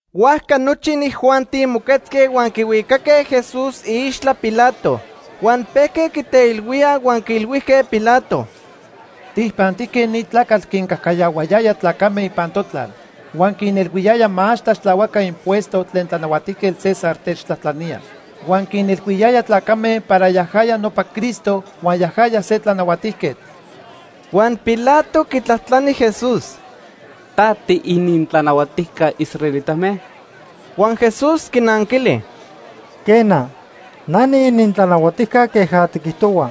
Huajca nochi inijuanti moquetzque huan quihuicaque Jesús iixtla Pilato. Huan pejque quiteilhuíaj huan quiilhuijque Pilato: ―Tijpantijque ni tlacatl quincajcayahuayaya tlacame ipan totlal huan quinilhuiyaya ma ax tlaxtlahuaca impuesto tlen Tlanahuatijquetl César techtlajtlanía. Huan quinilhuiyaya tlacame para yajaya nopa Cristo huan yajaya se tlanahuatijquetl. Huan Pilato quitlajtlani Jesús: ―¿Ta tiinintlanahuatijca israelitame? Huan Jesús quinanquili: ―Quena, na niinintlanahuatijca queja tiquijtohua.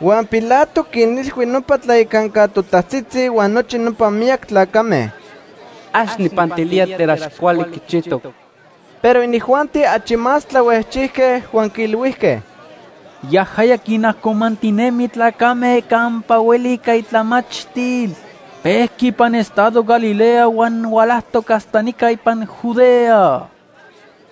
Huan Pilato quinilhui nopa tlayacanca totajtzitzi huan nochi nopa miyac tlacame: ―Ax nijpantilía tlen ax cuali quichijtoc. Pero inijuanti achi más tlahuejchijque huan quiilhuijque: ―Yajaya quinajcomantinemi tlacame campa hueli ica itlamachtil. Pejqui ipan estado Galilea huan hualajtoc hasta nica ipan Judea.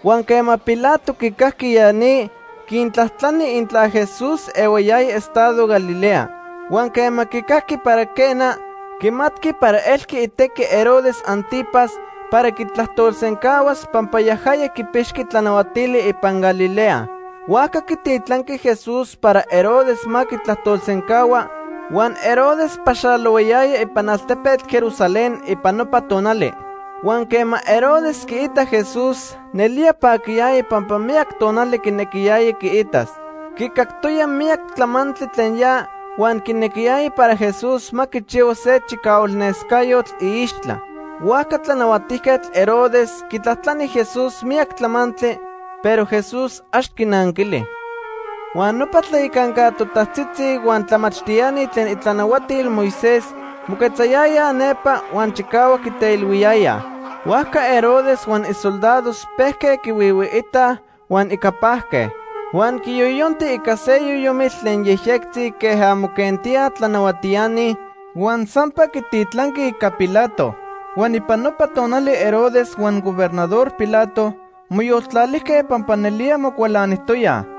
Huan quema Pilato quicajqui ya ni, quintlajtlani intla Jesús ehuayaya estado Galilea. Huan quema quicajqui para quena, quimatqui para elqui itequi Herodes Ántipas para quitlajtolsencahuas pampa yajaya quipixqui tlanahuatili ipan Galilea. Huajca quititlanqui Jesús para Herodes ma quitlajtolsencahua, huan Herodes paxalohuayaya ipan altepetl Jerusalén ipan nopa tonali. Huan quema Herodes quiitac Jesús, nelía paquiyaya pampa miyac tonali quinequiyaya quiitas. Quicactoya miyac tlamantli tlen ya huan quinequiyaya para Jesús ma quichihua se chicahualnescayotl iixtla. Huajca Tlanahuatijquetl Herodes quitlajtlani Jesús miyac tlamantli, pero Jesús ax quinanquili. Huan nopa tlayacanca totajtzitzi huan tlamachtiani tlen itlanahuatil Moisés moquetzayayaj nepa, huan chicahuac quiteilhuiyayaj. Huajca Herodes huan isoldados pejque quihuihuiitaj huan ica pajque. Huan quiyoyonti ica se yoyomitl tlen yejyectzi queja moquentíaj tlanahuatiani, huan sampa quititlanqui ica Pilato. Huan ipan nopa tonali Herodes huan Gobernador Pilato moyoltlalijque pampa nelía mocualanijtoyaj.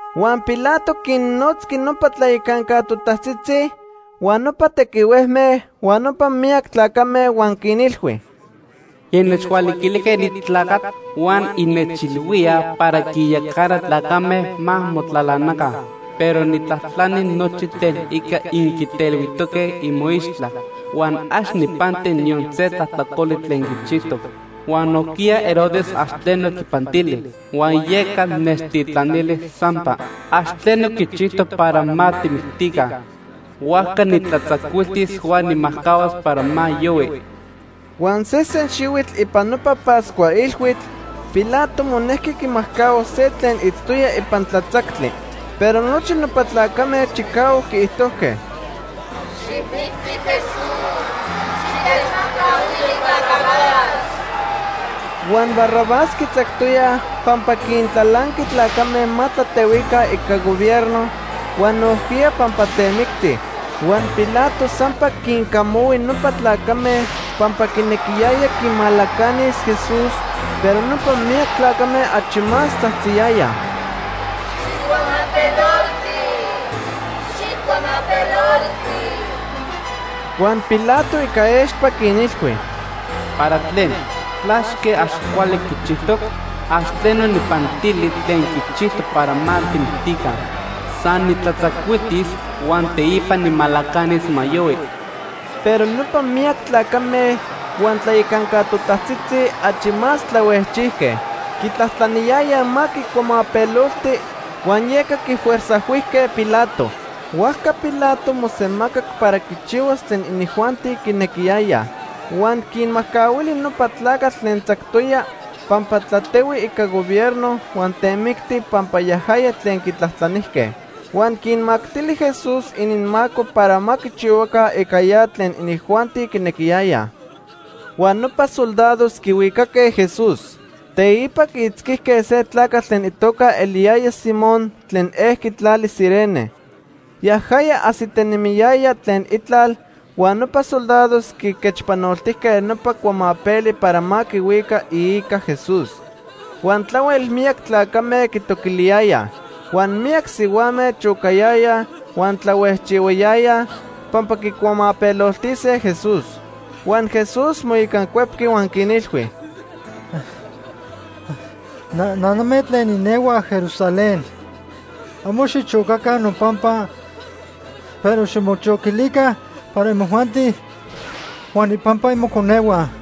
Huan Pilato quinnotzqui nopa tlayacanca totajtzitzi, huan nopa tequihuejme, huan nopa miyac tlacame huan quinilhui: ―Innechhualiquilijque ni tlacatl huan innechilhuíaj para quinyacana tlacame ma motlalanaca. Pero nijtlajtlani nochi tlen ica inquiteilhuijtoque imoixtla, huan ax nijpanti niyon se tlajtlacoli tlen quichijtoc. Huan nojquiya Herodes ax tleno quipantili, huan yeca nechtitlanili sampa. Ax tleno quichijtoc para ma tijmictica. Huajca nijtlatzacuiltis huan nijmajcahuas para ma yohui. Huan sesen xihuitl ipan nopa Pascua ilhuitl Pilato monejqui quimajcahuas se tlen itztoya ipan tlatzactli. Pero nochi nopa tlacame chicahuac quiijtojque: ―¡Xijmicti Jesús! ¡Xitechmajcahuili Barrabás! Huan Barrabás quitzactoyaj pampa quintlalanqui tlacame ma tlatehuica ica gobierno, huan nojquiya pampa temicti. Huan Pilato sampa quincamahui nopa tlacame pampa quinequiyaya quimalacanis Jesús, pero nopa miyac tlacame achi más tzajtziyayaj: ―¡Xijcuamapelolti! ¡Xijcuamapelolti! Huan Pilato ica expa quinilhui: ―¿Para tlen? ¿Tlaque ax cuali quichijtoc? Ax tleno nijpantili tlen quichijtoc para ma tijmictica. San nijtlatzacuiltis huan teipa nijmalacanis ma yohui. Pero nopa miyac tlacame huan tlayacanca totajtzitzi achi más tlahuejchijque. Quitlajtlaniyayaj ma quicuamapelolti huan yeca quifuerzajhuijque Pilato. Huajca Pilato mosemacac para quichihuas tlen inijuanti quinequiyayaj. Huan quinmajcahuili nopa tlacatl tlen tzactoya pampa tlatehui ica gobierno huan temicti pampa yajaya tlen quitlajtlanijque. Huan quinmactili Jesús ininmaco para ma quichihuaca ica ya tlen inijuanti quinequiyayaj. Huan nopa soldados quihuicaque Jesús. Teipa quiitzquijque se tlacatl tlen itoca eliyaya Simón tlen ejqui tlali Cirene. Yajaya ajsitinemiyaya tlen itlal huan nopa soldados quiquechpanoltijque nopa cuamapeli para ma quihuica iica Jesús. Huan tlahuel miyac tlacame quitoquiliyayaj. Huan miyac sihuame chocayayaj huan tlahuejchihuayayaj pampa quicuamapeloltise Jesús. Huan Jesús moicancuepqui huan quinilhui: ―Naname tlen inehuaj Jerusalén. Amo xichocaca nopampa, pero ximochoquilica para imojuanti huan ipampa imoconehua.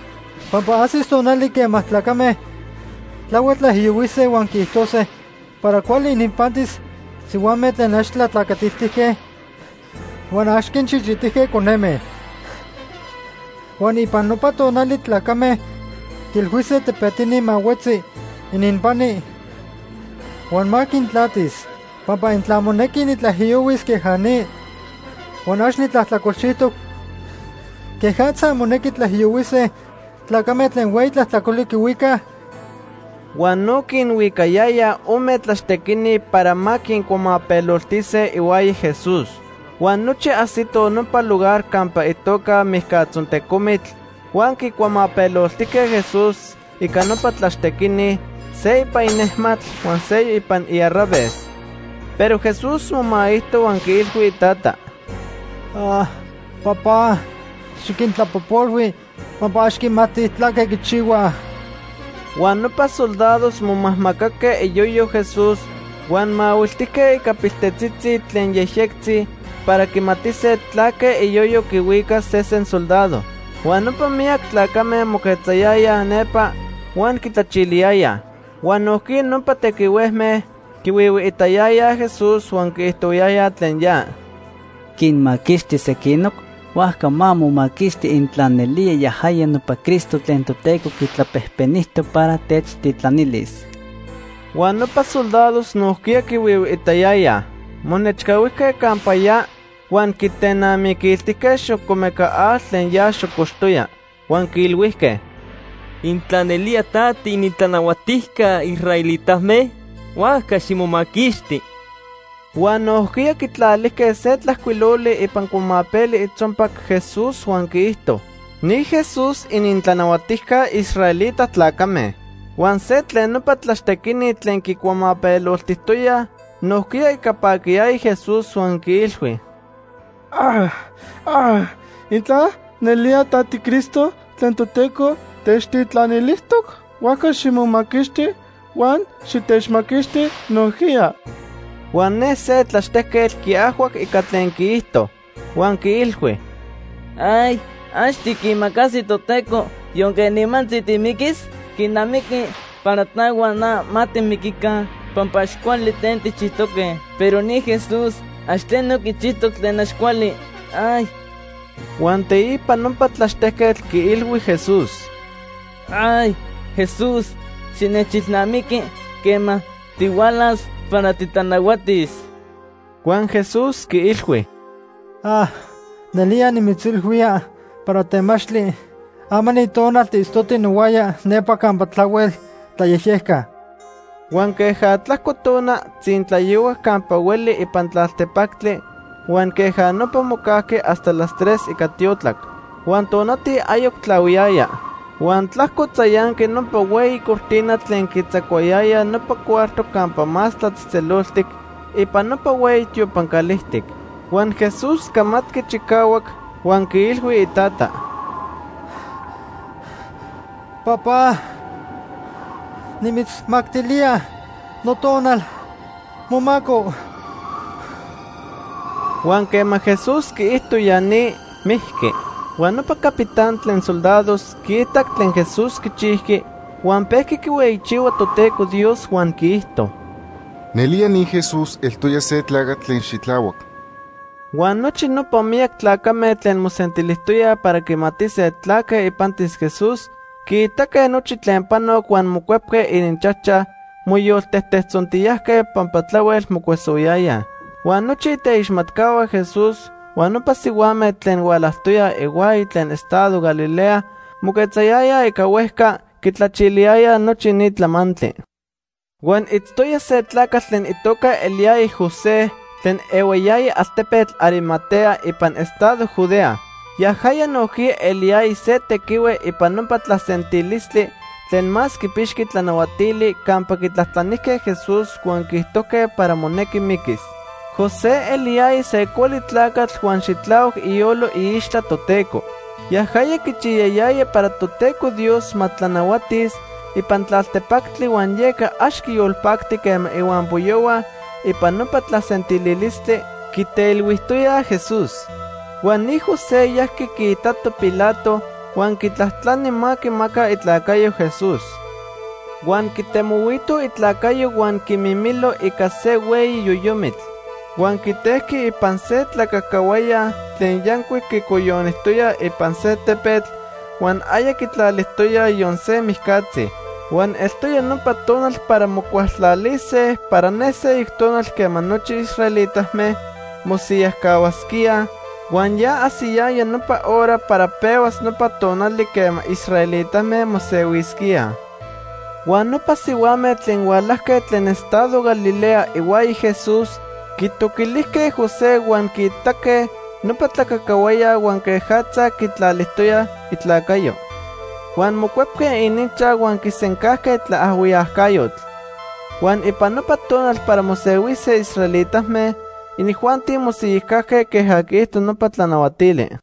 Pampa ajsis tonali quema tlacame tlahuel tlaijiyohuise huan quiijtose para cuali ininpantis sihuame tlen ax tlatlacatiltijque huan ax quinchichitijque coneme. Huan ipan nopa tonali tlacame quiilhuise tepetini ma huetzi ininpani huan ma quintlatis. Pampa intla monequi nitlaijiyohuis queja ni, huan ax nitlajtlacolchijtoc, ¿quejatza monequi tlaijiyohuise tlacame tlen hueyi tlajtlacoli quihuicaj? Huan no quinhuicayayaj ome tlaxtequini para ma quincuamapeloltise ihuaya Jesús. Huan nochi ajsitoj nopa lugar campa itoca Mijcatzontecomitl, huan quicuamapeloltijque Jesús ica nopa tlaxtequini, se ipan inejmatl huan seyoc ipan iarraves. Pero Jesús momaijto huan quiilhui iTata: ―Papá, xiquintlapojpolhui pampa ax quimatij tlaque quichihuaj. Huan nopa soldados momajmacaque iyoyo Jesús huan mahuiltijque ica piltetzitzi tlen yejyectzi para quimatise tlaque iyoyo quihuicas sesen soldado. Huan nopa miyac tlacame moquetzayayaj nepa huan quitlachiliyayaj. Huan nojquiya nopa tequihuejme quihuihuiitayayaj Jesús huan quiijtohuayayaj tlen ya: ―Quinmaquixti sequinoc, huajca ma momaquixti intla nelía yajaya nopa Cristo tlen Toteco quitlapejpenijtoc para techtitlanilis. Huan nopa soldados nojquiya quihuihuiitayayaj. Monechcahuijque campa ya huan quitenamiquiltijque xocomeca atl tlen ya xocoxtoya, huan quiilhuijque: ―Intla nelía ta tiinintlanahuatijca israelitame, huajca ximomaquixti. Huan nojquiya quitlalijque se tlajcuiloli ipan cuamapeli itzonpac Jesús huan quiijto: NI JESÚS ININTLANAHUATIJCA ISRAELITA TLACAME. Huan se tlen nopa tlaxtequini tlen quicuamapeloltijtoyaj nojquiya ica paquiyaya Jesús huan quiilhui: ―Intla nelía ta tiCristo tlen Toteco techtitlanilijtoc, huajca ximomaquixti huan xitechmaquixti nojquiya. Huan ne se tlaxtejquetl quiajhuac ica tlen quiijto. Huan quiilhui: ―¿Ax tiquimacasi Toteco, yonque nimantzi timiquis? Quinamiqui para ta huan na ma timiquica pampa ax cuali tlen tijchijtoque, pero ni Jesús ax tleno quichijtoc tlen ax cuali. Huan teipa nopa tlaxtejquetl quiilhui Jesús: ―Jesús, xinechilnamiqui quema tihualas para titlanahuatis. Huan Jesús quiilhui: ―Nelía nimitzilhuía para temachtli, ama ni tonal tiitztoti nohuaya nepa campa tlahuel tlayejyeca. Huan queja tlajco tona, tzintlayohuac campa hueli ipan tlaltepactli huan queja nopa mocajqui hasta las tres ica tiotlac. Huan tonati ayoc tlahuiyaya. Huan tlajco tzayanqui nopa hueyi cortina tlen quitzacuayayaj nopa cuarto Campa Más Tlatzejtzeloltic ipan nopa hueyi tiopan calijtic. Huan Jesús camatqui chicahuac, huan quiilhui iTata: ―Papá, nimitzmactilía notonal momaco. Huan quema Jesús quiijto ya ni, mijqui. Huan nopa capitán tlen soldados quiitac tlen Jesús quichijqui, huan pejqui quihueyichihua Toteco Dios huan quiijto: ―Nelía ni Jesús eltoya se tlacatl tlen xitlahuac. Huan nochi nopa miyac tlacame tlen mosentilijtoyaj para quimatise tlaque ipantis Jesús, quiitaque nochi tlen panoc huan mocuepque ininchajchaj moyoltejtejtzontiyajque pampa tlahuel mocuesohuayayaj. Huan nochi iteixmatcahua Jesús huan nopa sihuame tlen hualajtoyaj ihuaya tlen estado Galilea moquetzayayaj ica huejca, quitlachiliyayaj nochi ni tlamantli. Huan itztoya se tlacatl tlen itoca eliyaya José tlen ehuayaya altepetl Arimatea ipan estado Judea. Yajaya nojquiya eliyaya se tequihue ipan nopa tlasentilistli tlen más quipixqui tlanahuatili campa quitlajtlanijque Jesús huan quiijtojque para monequi miquis. José eliyaya se cuali tlacatl huan xitlahuac iyolo iixtla Toteco. Yajaya quichiyayaya para Toteco Dios ma tlanahuatis, ipan tlaltepactli huan yeca ax quiyolpacti quema ihuampoyohua ipan nopa tlasentililistli quiteilhuijtoyaj Jesús. Huan ni José yajqui quiitato Pilato huan quitlajtlani ma quimaca itlacayo Jesús. Huan quitemohuito itlacayo huan quiquimilo ica se hueyi yoyomitl. Huan quitejqui ipan se tlacacahuaya tlen yancuic quicoyonijtoya ipan se tepetl huan aya quitlalijtoyaj yon se mijcatzi. Huan eltoya nopa tonal para mocualtlalise para ne seyoc tonal quema nochi israelitame mosiyajcahuasquíaj, huan ya ajsiyaya nopa hora para pehuas nopa tonali quema israelitame mosehuisquíaj. Huan nopa sihuame tlen hualajque tlen estado Galilea ihuaya Jesús quitoquilijque José huan quiitaque nopa tlacacahuaya huan quejatza quitlalijtoya itlacayo. Huan mocuepque ininchaj huan quisencajque tlaajhuiyacayotl. Huan ipan nopa tonal para mosehuise israelitame, inijuanti mosiyajcajque queja quiijto nopa tlanahuatili.